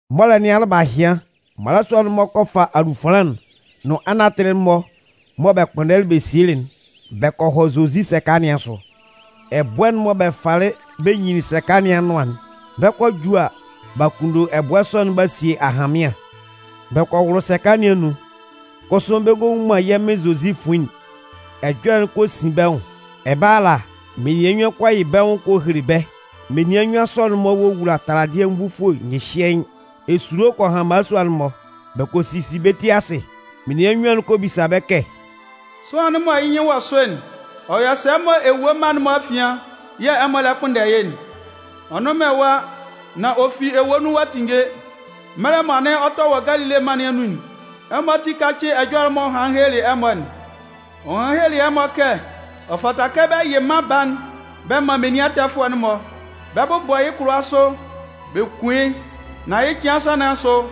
Mɔlɛ nɩn alɩbahɩan, mmalasua'n-mɔ kɔ fa alufanlan'n nʋn anatɩlɩ'n-mɔ mɔ bɛ kpʋnndɛlɩ bɛ sielɩ'n bɛ kɔ hɔ Zozi sɛka nɩn asʋ. Ɛbʋɛ'n mɔ bɛ falɩ bɛ nyinlin sɛka nɩn anʋan'n, bɛ 'kɔ a ju a, b'a kunndo ɛbʋɛ sɔ'n b'a sie ahanmɩan. Bɛ kɔ wʋlʋ sɛka nɩn anun, kʋsʋ bɛ ngɔ nwun man yɛ́ Mɩn Zozi fuin'n. Ɛjɔlɛ'n kɔ sin bɛ́ nwʋn. Ɛbɛlɛ ala, menian nnyuan kɔ yɩ bɛ́ nwʋn kɔ hele bɛ́. Menian nnyuan sɔ'n-mɔ wowula taladɩɛ nvufue nyɩhyɩɛɩn. Esulo kɔ han mmalasua'n-mɔ, bɛ kɔ sisi bɛ́ ti asɩ. Menian nnyuan'n kɔ bisa bɛ́ kɛ: “Sʋanlan'n mɔ yɩ́ nyɩn wɔ sʋ'n, ɔ yɔ sɛ mɔ ewue mma'n-mɔ afian yɛ̂ ɛmɔ lɛ kpʋnndɛ yɩ́'n? Ɔ nnʋn man ɛwa, nan ɔ fi ewue nun ɔ'a tinnge. Mɛlɛ mɔ anɩn ɔ tɛ wɔ Galile mân nɩn anun'n, ɛmɔ ati kácɩ ɛjɔlɛ'n m'ɔ hanlɩn helelɩ ɛmɔ'n. Ɔ hanlɩn helelɩ ɛmɔ kɛ: ‘Ɔ fata kɛ bɛ yɩ Mân Baa'n bɛ man menian ɛtɛfʋɛ'n-mɔ. Bɛ 'bʋbɔ yɩ́ kʋlʋwa sʋ bɛ kun yɩ́. Nan yɩ́ cɩan nsan nɩn asʋ,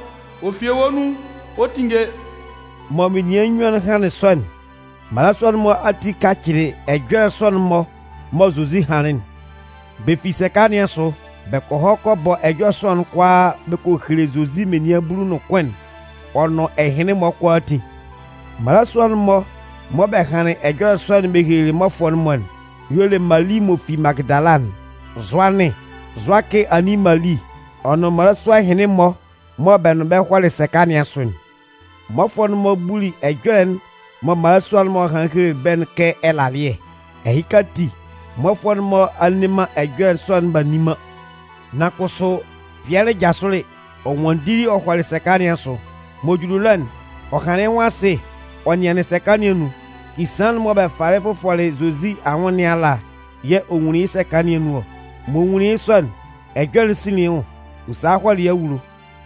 ɔ fi ewue nun ɔ 'tinnge.’” Mɔ menian nnyuan'n hanlɩn sɔ'n, mmalasua'n-mɔ ati kacɩlɩ ɛjɔlɛ sɔ'n-mɔ mɔ Zozi hanlɩn'n. Bɛ fi sɛka nɩn asʋ, bɛ kɔ hɔ kɔ bɔ ɛjɔlɛ sɔ'n kʋalaa bɛ kɔ hele Zozi menian bulu nʋn kʋn'n ɔ nʋn ɛhɩnlɩn-mɔ kʋalaatin. Mmalasua'n-mɔ mɔ bɛ hanlɩn ɛjɔlɛ sɔ'n bɛ helelɩ mmɔfʋɛ'n-mɔ'n y'ɔ le Mali m'ɔ fi Magɩdala'n, Zʋanɩn, Zʋakɩ anin Mali, ɔ nʋn mmalasua ɛhɩnlɩn-mɔ mɔ bɛ nʋn bɛ hɔlɩ sɛka nɩn asʋ'n. Mmɔfʋɛ'n-mɔ buli ɛjɔlɛ'n mɔ mmalasua'n-mɔ hanlɩn helelɩ bɛ́'n kɛ ɛlalɩɛ. Ɛhɩka ati, mmɔfʋɛ'n-mɔ a nne man ɛjɔlɛ sɔ'n b'a nni man. Nan kʋsʋ, Pɩɛlɩ jasʋlɩ, ɔ nwanndili ɔ hɔlɩ sɛka nɩn asʋ. M'ɔ juli ɛlɔ'n, ɔ hanlɩn yɩ́ nwʋn asɩ ɔ nɩanlɩn sɛka nɩn anun. Kisaan'n mɔ bɛ falɩ fʋfɔlɩ Zozi anwʋn nɩn ala yɛ̂ ɔ nwunlin yɩ́ sɛka nɩn anun ɔ. M'ɔ nwunlin yɩ́ sɔ'n, ɛjɔlɛ'n sinlin yɩ́ nwʋn, ɔ salɩ hɔlɩ yɩ́ awulo.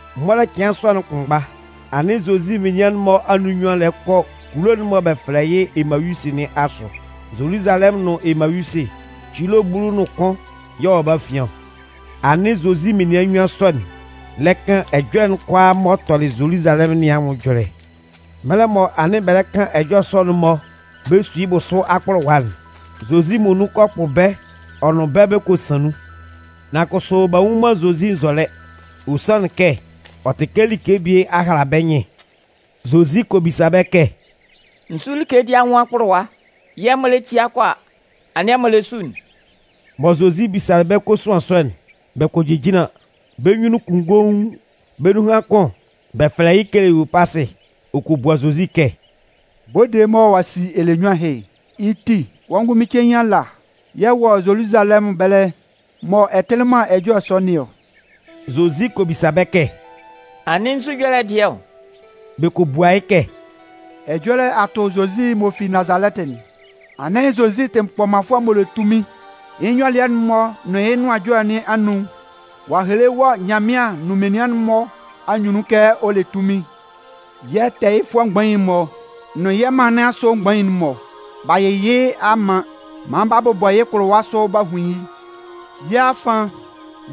Mɔlɛ cɩan sɔ'n kʋnmgba, anɩn Zozi menian'n-mɔ anun nnyuan lɛ kɔ kulo'n mɔ bɛ fɛlɛ yɩ́ Emayusɩ nɩn asʋ. Zoluzalɛmʋn nʋn Emayusɩ, cilo bulu ɔ nʋn kʋn y'ɔ wɔ bɛ́ afian ɔ. Anɩn Zozi menian nnyuan sɔ'n lɛ kan ɛjɔlɛ'n kʋalaa m'ɔ tɔlɩ Zoluzalɛmʋn nɩn anwʋn ɛjɔlɛ. Mɛlɛ mɔ anɩn bɛ lɛ kan ɛjɔlɛ sɔ'n-mɔ bɛ su yɩ́ bʋsʋ akpʋlʋwa'n, Zozi muonun kɔ kpʋ bɛ́ ɔ nʋn bɛ́ bɛ kɔ san nun. Nan kʋsʋ b'a nnwun man Zozi nzɔlɛ. Ɔ sanlɩn kɛ ɔ tɩ kɛ like bie a hala bɛ́ nyɩn. Zozi kɔ bisa bɛ́ kɛ: “Nzu like dɩɛ anwʋn akpʋlʋwa yɛ̂ ɛmɔ lɛ tia kɔ a, anɩn ɛmɔ lɛ su'n?” Mɔ Zozi bisalɩ bɛ́ kosuan sɔ'n, bɛ kɔ jejinlan, bɛ́ nyunnun kunngoun. Bɛ́ nunhan kʋn, bɛ fɛlɛ yɩ́ Keleyopasɩ, ɔ kɔ bua Zozi kɛ: “Bode'n mɔ ɔ'a si ɛlɛnyuan ɛhɩ'n, yɩ́ ti, wɔ́ ngʋnmɩn cein ala yɛ̂ ɛ wɔ Zoluzalɛmʋn ɛbɛlɛ mɔ ɛ tɩlɩ man ɛjɔlɛ sɔ nɩn ɔ?” Zozi kɔ bisa bɛ́ kɛ: “Anɩn nzu ɛjɔlɛ dɩɛ ɔ?” Bɛ kɔ bua yɩ́ kɛ: “Ɛjɔlɛ a tʋ Zozi m'ɔ fi Nazalɛtɩ'n. Anɩn Zozi tɩ kpɔmanfʋɛ m'ɔ le tunmin. Yɩ́ nyɔlɩɛ'n-mɔ nʋn yɩ́ nʋan ɛjɔlɛ nɩn anun, ɔ'a hele wɔ Nyanmɩan nʋn menian'n-mɔ anyunnun kɛ ɔ le tunmin. Yɛ́ tɛɛyɩfʋɛ mgbain'n-mɔ nʋn yɛ́ mân nɩn asʋ mgbain'n-mɔ, b'a yɩ yɩ́ a man maan b'a bʋbɔ yɩ́ kʋlʋwa sʋ b'a hun yɩ́. Yɛ́ afan,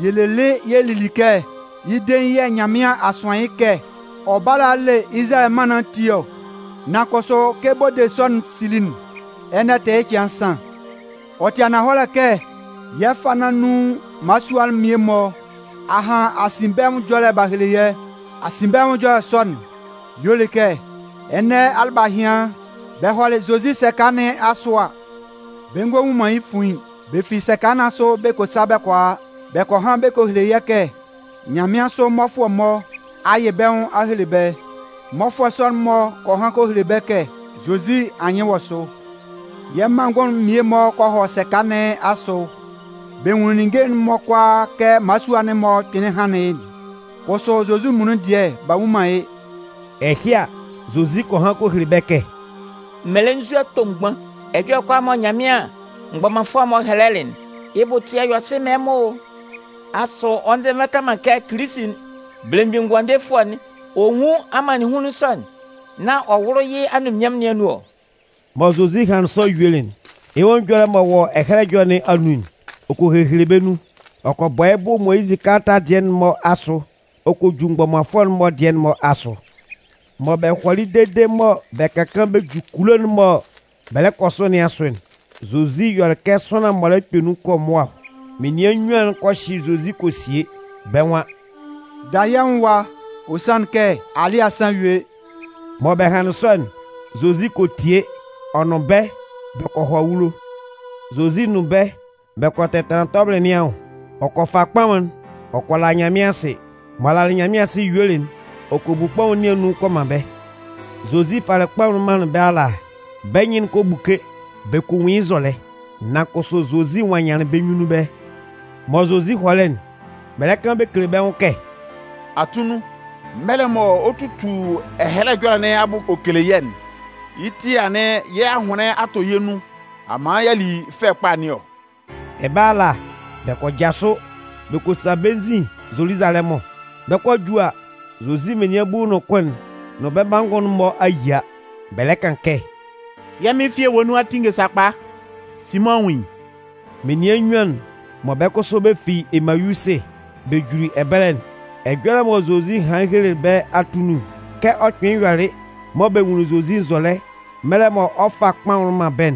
yɛ lelɩ yɛ lili kɛ, yɩ́ dein yɛ̂ Nyanmɩan a sʋan yɩ́ kɛ ɔ bála a a le Izalayɛ mân nɩn ati ɔ. Nan kʋsʋ, kɛ bode sɔ'n sili'n, ɛnɛ tɩ yɩ́ cɩan nsan. Ɔ tɩ ananhɔlɛ kɛ yɛ́ fâ nɩn anun mmalasua mmie-mɔ a han asinbɛnwʋn ɛjɔlɛ b'a hele yɛ́. Asinbɛnwʋn ɛjɔlɛ sɔ'n y'ɔ le kɛ, ɛnɛ alɩbahɩan bɛ hɔlɩ Zozi sɛka nɩn asʋ a, bɛ ngɔ nwun man yɩ́ fuin'n. Bɛ fi sɛka nɩn asʋ bɛ kɔ sa bɛ kɔ a. Bɛ kɔ han bɛ kɔ hele yɛ́ kɛ nyanmɩansʋ mmɔfʋɛ-mɔ a yɩ bɛ́ nwʋn a hele bɛ́. Mmɔfʋɛ sɔ'n-mɔ kɔ han kɔ hele bɛ́ kɛ Zozi anyɩn wɔ sʋ. Yɛ́ manngʋn'n mmie-mɔ kɔ hɔ sɛka nɩn asʋ. Bɛ nwunlin ninnge'n-mɔ kʋalaa kɛ mmalasua'n-mɔ kpɩnlɩn hanlɩn yɩ́'n. Kʋsʋ, Zozi muonun dɩɛ, b'a nnwun man yɩ́.” Ɛhɩ a, Zozi kɔ han kɔ hele bɛ́ kɛ: “Mmelenzua tomgban! ɛjɔlɛ kʋalaa mɔ Nyanmɩan mgbɔmanfʋɛ'n-mɔ a hɛlɛ'n, yɩ́ bʋ ɛtɩɛ yɔ sɩ man ɛmɔ o! Asʋ, ɔ nzɛ nvata man kɛ Kilisi'n, Belemgbin Ngʋandefʋɛ'n, ɔ nwún amannɩnhunlun sɔ'n nán ɔ wʋ́lʋ yɩ́ anunminnyanmʋn nɩn anun ɔ? Mɔ Zozi hanlɩn sɔ yuelɩ'n, yɩ́ nwʋn ɛjɔlɛ m'ɔ wɔ Ɛhɛlɛ Ɛjɔlɛ nɩn anun'n, ɔ kɔ hehele bɛ́ nun. Ɔ kɔ bɔ yɩ́ bʋ Moyizɩ kalata dɩɛ'n-mɔ asʋ ɔ kɔ ju mgbɔmanfʋɛ'n-mɔ dɩɛ'n-mɔ asʋ.” Mɔ bɛ hɔlɩ dede mɔ bɛ ka kaan bɛ ju kulo'n mɔ bɛ lɛ kɔ sʋ nɩn asʋ'n, Zozi yɔlɩ kɛ sʋanlan m'ɔ lɛ kpɛ nun ɔ kɔ mʋa ɔ. Menian nnyuan'n kɔ hyɩ Zozi kɔ sie, bɛ́ nwan: “Da yɛ́ nwʋn ɛwa. Ɔ sanlɩn kɛ alɩ́ɛ a san a yue.” Mɔ bɛ hanlɩn sɔ'n, Zozi kɔ tie ɔ nʋn bɛ́ bɛ kɔ hɔ awulo. Zozi nʋn bɛ́ bɛ kɔ tɛtanlan tɔbɩlɩ nɩn anwʋn. Ɔ kɔ fa kpaʋn'n ɔ kɔ la Nyanmɩan asɩ. M'ɔ lalɩ Nyanmɩan asɩ yuelɩ'n, ɔ kɔ bu kpaʋn nɩn anun ɔ kɔ man bɛ́. Zozi falɩ kpaʋn'n manlɩn bɛ́ ala a, bɛ́ nyɩn'n kɔ buke bɛ kɔ nwun yɩ́ nzɔlɛ. Nan kʋsʋ Zozi nwannyanlɩn bɛ́ nyunnun ɛbɛlɛ. Mɔ Zozi hɔlɩ'n, bɛ lɛ kan bɛ kele bɛ́ nwʋn kɛ: “Atunnun, mɛlɛ mɔ ɔ 'tutu Ɛhɛlɛ Ɛjɔlɛ nɩn abʋ ɔ kele yɛ́'n, yɩ́ ti yɛ̂ anɩn yɛ́ ahʋnlɩn a tɔ yɛ́ nun a man y'a li fɛ kpa nɩn ɔ.” Ɛbɛlɛ ala, bɛ kɔ jasʋ bɛ kɔ sa bɛ́ nzin Zoluzalɛmʋn. Bɛ kɔ 'ju a, Zozi menian bulu nʋn kʋn'n nʋn bɛ́ manngʋn'n-mɔ a yia. Bɛ lɛ kan kɛ: “Yɛ́ Mɩn fi ewue nun a tinnge sakpa! Simʋn a nwun yɩ́!” Menian nnyuan'n mɔ bɛ́ kʋsʋ bɛ fi Emayusɩ bɛ juli ɛbɛlɛ'n, ɛjɔlɛ mɔ Zozi hanlɩn helelɩ bɛ́ atunnun, kɛ ɔ kpɩnlɩn yɔlɩ mɔ bɛ nwunlin Zozi nzɔlɛ mɛlɛ mɔ ɔ 'fa kpaʋn'n man bɛ́'n,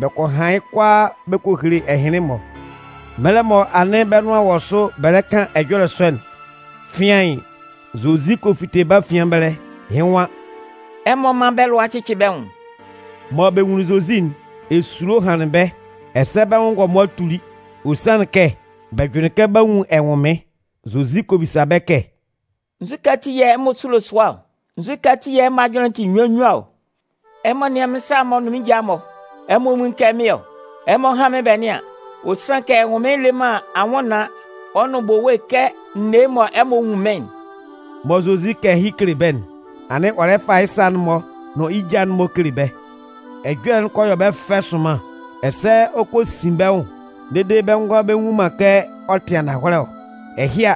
bɛ kɔ han yɩ́ kʋalaa bɛ kɔ hele ɛhɩnlɩn-mɔ. Mɛlɛ mɔ anɩn bɛ́ nʋan wɔ sʋ bɛ lɛ kan ɛjɔlɛ sɔ'n, fɩaɩn, Zozi kɔ fite bɛ́ afian ɛbɛlɛ, yɩ́ nwan: “Ɛmɔ mán bɛ́ lʋa cɩ́cɩ bɛ́ nwʋn!” Mɔ bɛ nwunlin Zozi'n, esulo hanlɩn bɛ́ ɛsɛ bɛ́ nwʋn ngɔmʋa tuli. Ɔ sanlɩn kɛ bɛ jʋnlɩn kɛ b'a nwun ɛnwʋnmɩn. Zozi kɔ bisa bɛ́ kɛ: “Nzukɛ ati yɛ̂ ɛmɔ sulo sʋa ɔ? Nzukɛ ati yɛ̂ ɛmɔ ajʋnlɩn'n tɩ nnyuan nnyuan ɔ? Ɛmɔ nɩ́an mɩ́n sa'n-mɔ nʋn mɩ́n ja'n-mɔ! Ɛmɔ nwun yɩ́ kɛ mɩ́n ɔ! Ɛmɔ hán mɩ́n bɛ nɩ́an. Ɔ sanlɩn kɛ ɛnwʋnmɩn lɛ man anwʋnnaan ɔ nʋn bowe kɛ n ne yɩ́ mɔ ɛmɔ nwun mɩ́n'n.” Mɔ Zozi 'kan ɛhɩ kele bɛ́'n, anɩn ɔ lɛ fa yɩ́ sa'n-mɔ nʋn yɩ́ ja'n-mɔ kele bɛ́. Ɛjɔlɛ'n kɔ yɔ bɛ́ fɛ sʋnman, ɛsɛ ɔ kɔ sin bɛ́ nwʋn dede bɛ ngʋala bɛ nnwun man kɛ ɔ tɩ ananhɔlɛ ɔ. Ɛhɩ a,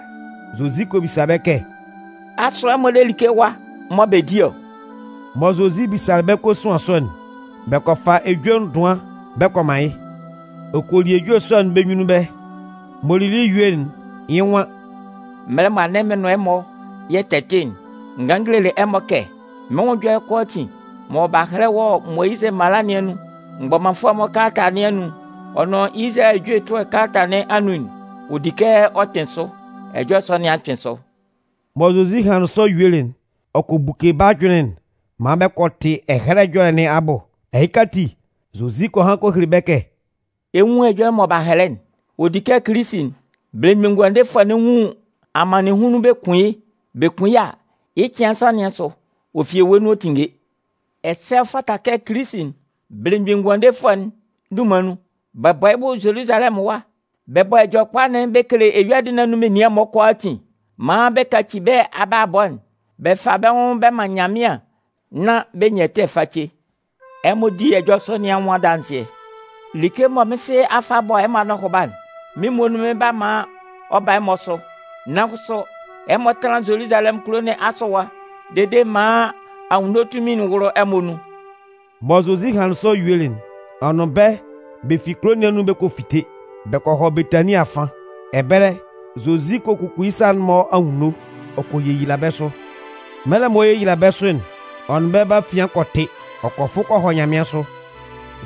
Zozi kɔ bisa bɛ́ kɛ: “Asʋ ɛmɔ le like ɛwa mɔ bɛ di ɔ?” Mɔ Zozi bisalɩ bɛ́ kosuan sɔ'n, bɛ kɔ fa ejue ndʋan bɛ kɔ man yɩ́. Ɔ kɔ li ejue sɔ'n bɛ́ nyunnun ɛbɛlɛ. M'ɔ lili yuelɩ'n, yɩ́ nwan: “Mɛlɛ mɔ anɩn mɩn nʋn ɛmɔ yɛ tɛ tɩ'n, n ganlɩn n gelelɩ ɛmɔ kɛ, mɩ́n nwʋn ɛjɔlɛ'n kʋalaatin mɔ b'a hɛlɛ wɔ Moyizɩ mala nɩn anun, mgbɔmanfʋɛ'n-mɔ kalata nɩn anun, ɔ nʋn Izalayɛ ejue ɛtʋɛ kalata nɩn anun'n, ɔ di kɛ ɔ kpɩn sʋ. Ɛjɔlɛ sɔ nɩn a kpɩn sʋ.” Mɔ Zozi hanlɩn sɔ yuelɩ'n, ɔ kɔ buke bɛ́ ajʋnlɩn'n maan bɛ kɔ tɩ Ɛhɛlɛ Ɛjɔlɛ nɩn abʋ. Ɛhɩka ati, Zozi kɔ han kɔ hele bɛ́ kɛ: “Ɛ 'nwun ɛjɔlɛ mɔ b'a hɛlɛ'n: ɔ di kɛ Kilisi'n, Belemgbin Ngʋandefʋɛ'n, nwun amannɩnhunlun bɛ kun yɩ́. Bɛ kun yɩ́ a, yɩ́ cɩan nsan nɩn asʋ, ɔ fi ewue nun ɔ 'tinnge. Ɛsɛ ɔ fata kɛ Kilisi'n, Belemgbin Ngʋandefʋɛ'n, dunman nun, bɛ bɔ yɩ́ bʋ Zoluzalɛmʋn ɛwa, bɛ bɔ Ɛjɔlɛkpa'n bɛ kele eyuadɩ nɩn anun menian'n-mɔ kʋalaatin maan bɛ kaci bɛ́ abalabɔ'n bɛ fa bɛ́ nwʋn bɛ man Nyanmɩan nán b'a nyan ɛtɛ face. Ɛmɔ di ɛjɔlɛ sɔ nɩn anwʋn adanzɩɛ. Like'n mɔ mɩ́n Sɩ a fa a bɔ ɛmɔ anɔhʋba'n, mɩ́n muonun mɩn 'ba man ɔ ba ɛmɔ sʋ. Nan kʋsʋ, ɛmɔ tánlan Zoluzalɛmʋn kulo nɩn asʋ ɛwa dede maan anwunno tunmin'n wʋ́lʋ ɛmɔ nun.” Mɔ Zozi hanlɩn sɔ yuelɩ'n, ɔ nʋn bɛ́ bɛ fi kulo nɩn anun bɛ kɔ fite. Bɛ kɔ hɔ Betanin afan. Ɛbɛlɛ, Zozi kɔ kuku yɩ́ sa'n-mɔ anwunno ɔ kɔ yeyila bɛ́ sʋ. Mɛlɛ mɔ ɔ 'yeyila bɛ́ sʋ'n, ɔ nʋn bɛ́ bɛ́ afian kɔ tɩ, ɔ kɔ fʋ kɔ hɔ nyanmɩansʋ.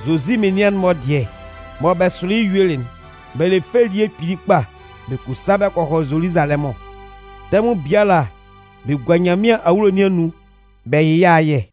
Zozi menian'n-mɔ dɩɛ, mɔ bɛ sʋlɩ yɩ́ yuelɩ'n, bɛ le fɛ elie kpili kpa bɛ kɔ sa bɛ kɔ hɔ Zoluzalɛmʋn. Tɛmʋn biala bɛ gua Nyanmɩan awulo nɩn anun bɛ yɩ yɩ́ ayɛ.